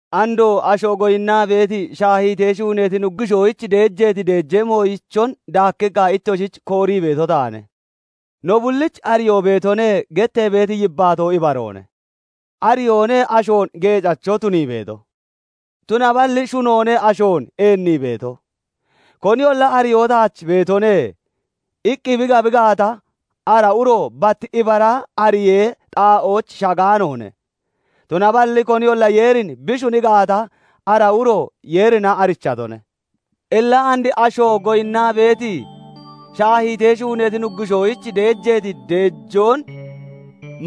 Andoo asho goyinnaa beeti shaahiitee shuuneeti nuggushoyich deejeeti deejee mooyichon daakkiqqa ittoshich koorii beeto taane. "No bullich ariyoo beetone" gettee beeti yibbaatoo ibaroone. Ariyoone ashoon geecacho tunii beeto; tunaballi shunoone ashoon eennii beeto. Koniyolla "Ariyoo taach beetone" iqqi bi gabi gaata, ara uro bat ibara ariyee xaa'ooch shagaanoone; tunaballi koniyolla Yeerin bi shuni gaata, ara uro Yeerina arichatone. Illa and asho goyinnaa beeti shaahiitee shuuneeti nuggushoyich deejeeti deejoon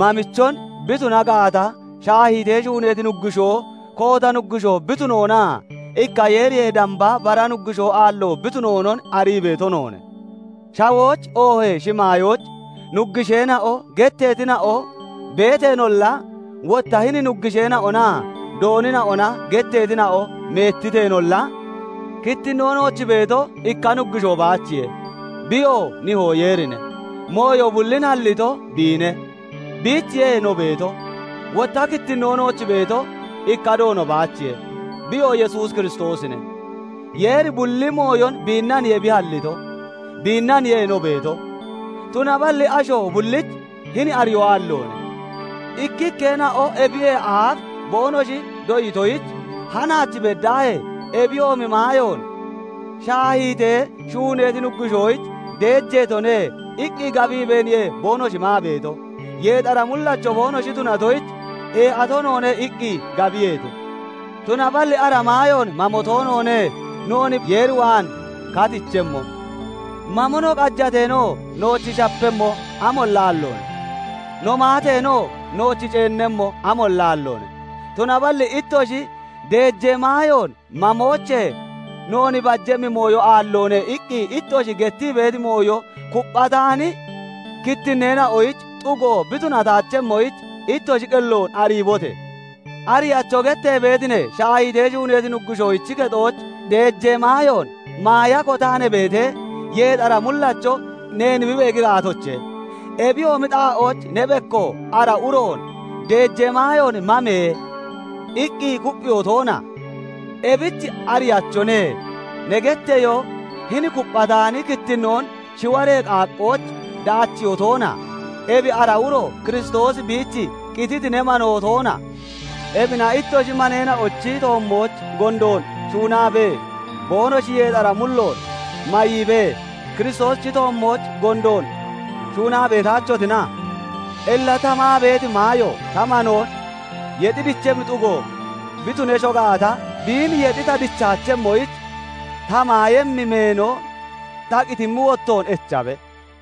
mamichon bi tuna gaata, shaahiitee shuuneeti nuggushoo koota nuggushoo bi tunoonaa ikka Yeeriyee damba bara nuggushoo aallo bi tunoonon arii beeto noone. Shawooch oohee shimaayooch "nuggusheena'o" getteetina'o beeteenolla, wotta hini "nuggusheena'onaa doonina'ona" getteetina'o meettiteenolla, kittinnoo nooch beeto, ikka Nuggushoo baachiye; biyoo Nihoo Yeerine; mooyo bullin hallito, biine; biichiye no beeto. Wotta kittinnoo nooch beeto, ikka Doono baachiye; biyoo Yesuus Kiristoosine; Yeeri bulli mooyon biinnaniye bi halliito; biinnaniye no beeto. Tunaballi asho bullich hini ariyoo aalloone. Ikkikkeena'o ebiyee aaf boonoshi doyitoyich, hanaach beddaahee ebiyoomi maayoon "Shaahiitee shuuneeti nuggushoyich deejeetone" iqqi gabiibeeniye boonoshi maa beeto; yeexara mullacho boonoshi tunatoyich, "Ee'ato noone" iqqi gabiyeete. Tunaballi ara maayoon mamo toonoone noon Yeer waan katichemmo; mamo no qajateenoo nooch shapemmo amolla aalloone; no maateenoo, nooch ceennemmo amolla aalloone. Tunaballi ittoshi "Deejee maayoon mamoochee noon bajemmi mooyo aalloone" iqqi ittoshi gettii beeti mooyo kupphataani kittinneena'oyich xugo bi tunataachemmoyich, ittoshi qelloon ariibote! "Ariyacho" gettee beeti ne, shaahiitee shuuneeti nuggushoochi kexooch deejee maayoon maaya kotaa ne beetee, yeexara mullacho neen bi beegi gaatoche? Ebiyoomi xaa'ooch ne bekko ara uroon "Deejee maayoon mame!" iqqi kupphiyoo toona? Ebich "Ariyachone" ne getteyoo hini kupphataani kittinnoon shiwaree qaaqqooch daachiyoo toona? Ebi ara uro Kiristoosi biich qititi ne manoo toona? Ebina ittoshi maneena'ochi toommooch gondoon shuunaabee, boonoshi yeexara mulloon mayiibee, Kiristoosichi toommooch gondoon shuunaa beetaachotina? Illa ta maa beeti maayo ta manoon yexi dichemmi xugo bi tunesho gaata, biin yexi ta dichaachemmoyich, ta maayemmi meeno ta qitimmi wottoon echabe!